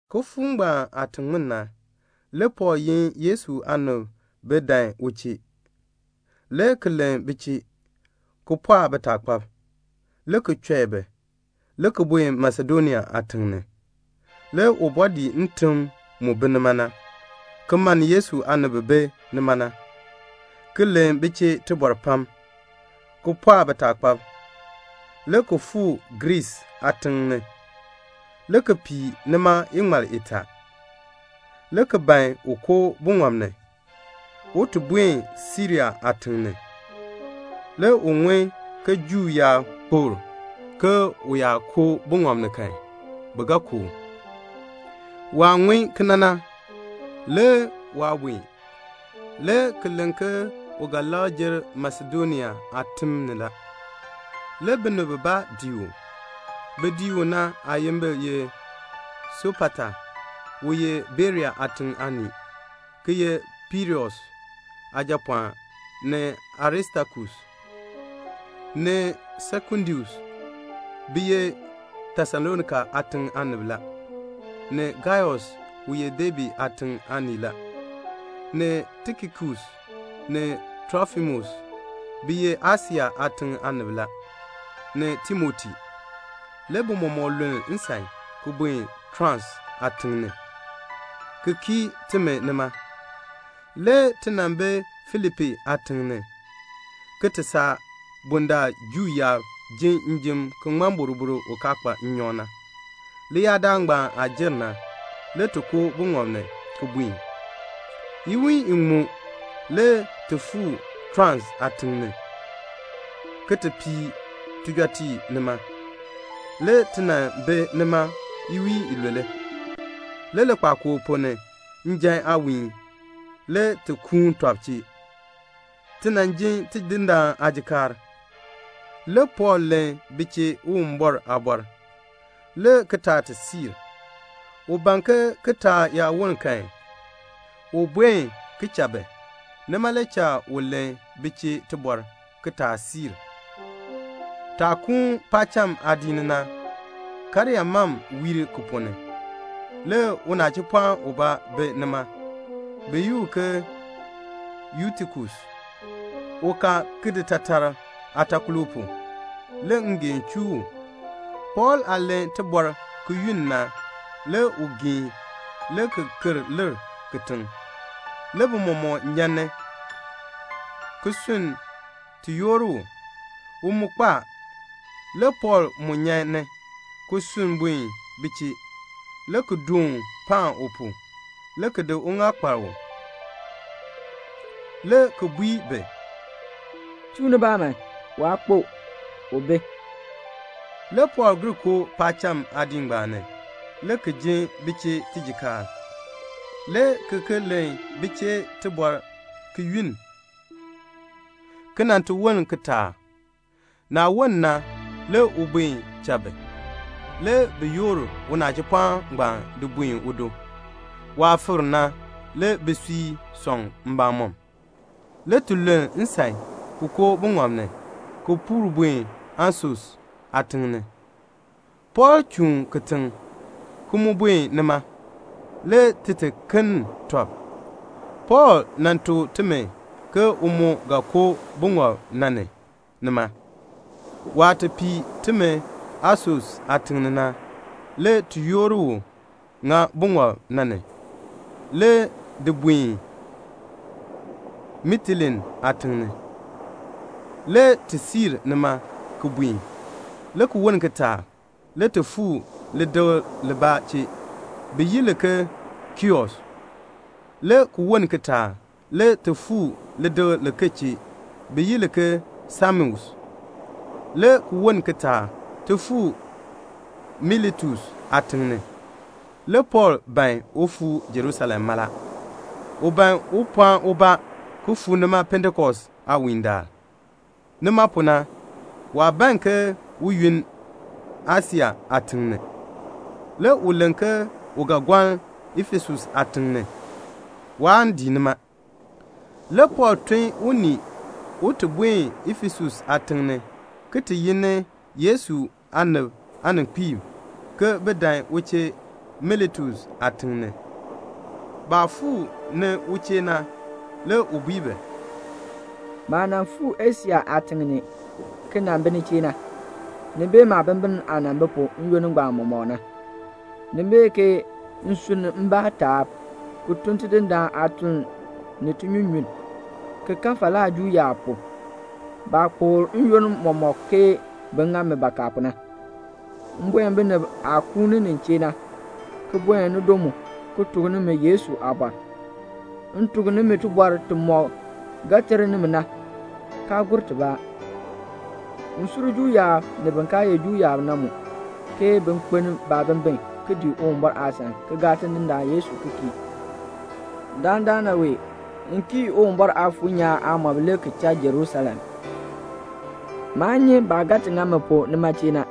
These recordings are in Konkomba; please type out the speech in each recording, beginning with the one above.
Kifuuk ngbaan aah ti ŋmin na, le Pɔɔl yin Yesu aanib ke bin dan u chee, le ki len bi chee, ki pɔɔk bitaakpab, le ki chɔi bi, le ki buen Masedonia aatiŋ ni. Le u bɔɔ dii ntim mu bi nima na, ki mann Yesu aanib bi bi nima na, ki len bi chee tibɔr pam, ki pɔɔk bitaakpab, le ki fuu Griis aatiŋ ni, le ki pii nima iŋmal itaa, le ki ban un koo buŋɔb ni, un ti buen Siria aatiŋ ni. Le u ŋun ke Juu yaab kpokl ke u yaa koo buŋɔb na ni kan, bi ga ku u. Waah ŋun kena na, le waa buen, le ki len ke u ga labr jer Masedonia aatim ni la. Le binib bibaa dii u. Bin dii u na aayimbil ye Sopata, u ye Berea aatiŋ aanii, ki ye Pirus aajapɔɔn; ni Aristakus, ni Sekundus, bi ye Tesalonika aatiŋ aanib la; ni Gaius, u ye Debe aatiŋ aanii la; ni Tikikus, ni Trofimus, bi ye Asia aatiŋ aanib la; ni Timoti. Le bi mɔmɔk luln nsan ki buen Troas aatiŋ ni, ki kii timi nima. Le ti nan bi Filipi aatiŋ ni, ki ti saa bundaln Juu yaab ji njim ki ŋmɔ boroboro u kaa kpa nnyɔk na. Leyaadaal ngbaan aah jer na, le ti koo buŋɔb ni ki buen. Iwiin iŋmu le ti fuu Troas aatiŋ ni, ki ti pii tijɔtiib nima. Le ti nan bi nima iwiin ilule. Le likpakool ponn ni, njan aawiin, le ti kuun tɔb chee ti nan ji Tidindaan aajikaar. Le Pɔɔl len bi chee Uwumbɔr aabɔr le kitaatisiirk. U ban ke kitaak yaa woln kan, un buen ki cha bi. Nima le cha u len bi chee tibɔr kitaatisiirk. Taah kuun paacham aadiik ni na, karyaa mam wiir ki ponn ni. Le unachipɔɔn ubaa bi nima, bi yi u ke Yutikus. U ka kiditaatark aatakolo pu. Le ngeen chuu u. Pɔɔl aah len tibɔr ki yunn na, le u geen, le ki ker lir kitiŋ. Le bi mɔmɔk nyan ni, ki sunn ti yoor u. U mu kpo a. Le Pɔɔl mu nyan ni, ki sunn buen bi chee, le ki doon paan u pu, le ki di uŋaal kpar u, le ki bui bi, "Chuu nibaa man. Waa kpo. U bi." Le Pɔɔl gir koo paacham aadiik ngbaan ni, le ki jin bi chee tijikaar, le ki ki len bi chee tibɔr ki yunn, ki nan ti woln kitaak. Naah woln na, le u buen cha bi. Le bi yoor unachipɔɔn ngbaan di buen udo. Waah fikr na, le bisui sɔŋ mbamɔm. Le ti luln nsan ki koo buŋɔb ni, ki puur buen Asos aatiŋ ni. Pɔɔl chuun kitiŋ, ki mu buen nima, le ti ti kenn tɔb. Pɔɔl tuk timi ke u mu ga koo buŋɔb na ni nima. Waah ti pii timi Asos aatiŋ ni na, le ti yoor u ŋa buŋɔb na ni, le di buen Mitilene aatiŋ ni. Le ti siir nima ki buen. Le ki woln kitaak le ti fuu lidikl libaa chee, le bi yi li ke Kios, le ki woln kitaak le ti fuu lidikl liken chee, bi yi li ke Samos, le ki woln kitaak ti fuu Miletus aatiŋ ni. Le Pɔɔl ban un fuu Jerusalem mala. U ban un pɔɔn ubaa ki fuu nima Pentekost aawiindaal. Nima pu na, waa ban ke un yunn Asia aatiŋ ni. Le u len ke u ga gɔln Efesus aatiŋ ni. Waan dii nima. Le Pɔɔl tun unii un ti buen Efesus aatiŋ ni ki ti yi ni Yesu aanib aaninkpiib, ke bin dan u chee Miletus aatiŋ ni. Baah fuu ni u chee na, le u bui bi, "Maah nan fuu Asia aatiŋ ni, ki nan bi ni chee na, ni bee maabimbin aah nan bi pu n-yoonn ngbaan mɔmɔk na. Ni bee ke m sunn mbaa taab, ki tun Tidindaan aatuln ni tinyunyunn, ki kan falaa Juu yaab pu, baah kpokl n-yoonn mɔmɔk ke bin ŋa mi bakaa pu na. M buen binib aah kuuni nin chee na, ki buen nido mu, ki tuk nimi Yesu aabɔr. M tuk nimi tibɔr timɔk ga ter nimi na, kaa gur tibaa. M sur Juu yaab ni bin kaa ye Juu yaab na mu, ke bin kpeln baabimbin ki dii Uwumbɔr aasan ki gaa Tidindaan Yesu ki kii. Dandana wee m kii Uwumbɔr Aafuur nyaan aamɔb le ki cha Jerusalem. Maa nyi baah ga ti ŋa mi pu nima chee na.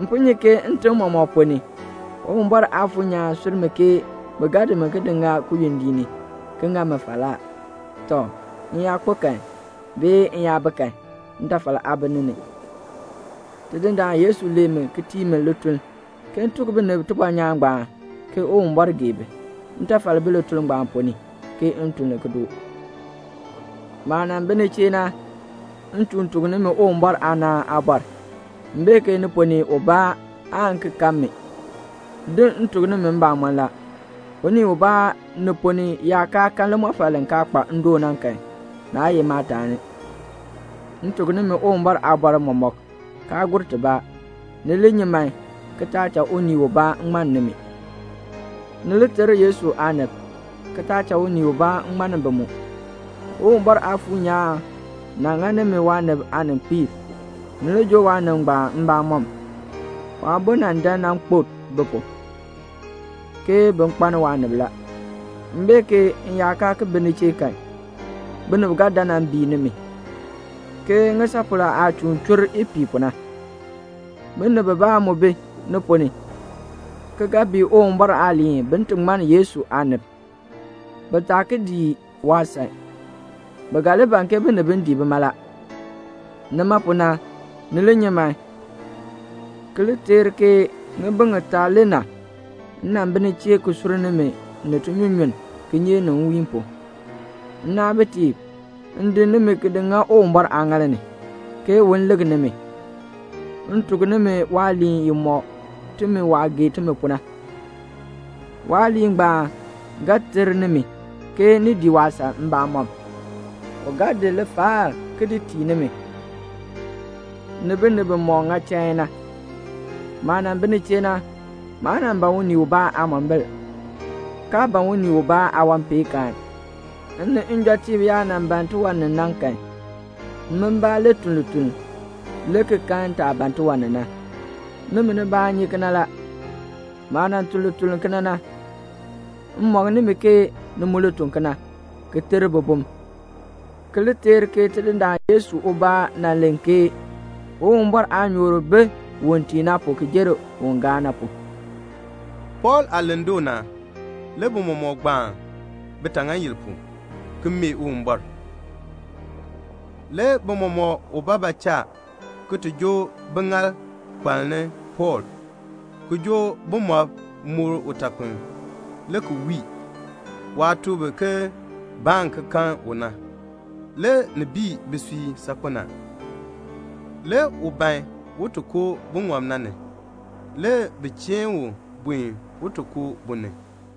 M po nyi ke ntim mɔmɔk ponn ni, Uwumbɔr Aafuur nyaan sur mi ke bi ga di mi ki di ŋa kiyondiik ni, ki ŋa mi falaa. Tɔ, m yaa kpo kan, m yaa bi kan, ntafal aa bi ni ni. Tidindaan Yesu lee mi ki tii mi lituln, ke m tuk binib tibɔnyaan ngbaan, ke Uwumbɔr gee bi. Ntafal bi lituln ngbaan ponn ni, ke m tun li ki doo. "Maah nan bi ni chee na, m chuun tuk nimi Uwumbɔr aanaan aabɔr. M bee ke ni ponn ni ubaa aan ki kan mi. Din, m tuk nimi mbamɔn la, unii ubaa ni ponn ni yaa kaa kan limɔfal li kaa kpa ndoon na kan, naa ye maataani. M tuk nimi Uwumbɔr aabɔr mɔmɔk, kaa gur tibaa. Ni li nyi man, ki taa cha unii ubaa ŋmann nimi. Ni li ter Yesu aanib, ki taa cha unii ubaa ŋmann bi mu. Uwumbɔr Aafuur nyaan nan ŋa nimi waanib aaninkpiib. Ni li joo waanib ngbaan mbamɔm. Waabo nan dan nan kpo bi pu, ke bin kpaln waanib la. M bee ke m yaa kaa ki bi ni chee kan, binib ga dan nan bii nimi, ke ŋisapol aah chuun chur ipiih pu na. Binib bibaa mu bi ni ponn ni, ki ga bii Uwumbɔr aaliin bin ti ŋmann Yesu aanib, bi taa ki li dii waasan. Bi ga li ban ke bin dii bima la. Nima pu na, ni li nyi man, ki li teer ke ŋibin ŋitaa le na, m nan bi ni chee ki sur nimi ni tinyunyunn, kinyeek ni nwiin pu. "Nnaabitiib, m di nimi di ŋa Uwumbɔr aaŋaal ni, ke u li lik nimi. M tuk nimi waaliin i mɔk timi waah gee timi pu na. Waaliin ngbaan ga ter nimi, ke ni dii waasan mbamɔm. U ga di lifaal ki di tii nimi, ni binib bimɔk ŋa chain na. Maah nan bi ni chee na, maa nan ban unii ubaa aamombil, kaa ban unii ubaa aawanpeenkaan. M ni njɔtiib yaa nan ban tiwan ni na kan, min mbaa le tun lituln, le ki kan taah ban tiwan ni na. Nimi nibaa nyi kena la. Maah tun lituln kena na, m mɔk nimi ke ni mu li tun kena, ki ter bibum, ki li teer ke Tidindaan Yesu ubaa nan len ke, 'Uwumbɔr aanyoor bi un tii na pu ki jer un gaa na pu."' Pɔɔl aah len doo na, le bi mɔmɔk gbaan bitaŋaayil pu, ki mee Uwumbɔr. Le bi mɔmɔk ubaabaa cha ki ti joo biŋaal kparni Pɔɔl, ki joo bumɔb moor utakpiln, le ki wii. Waah tuk bi ke baan ki kan u na, le ni bii bisui saakpen a. Le u ban un ti koo buŋɔb na ni. Le bi cheen u buen un ti koo bu ni.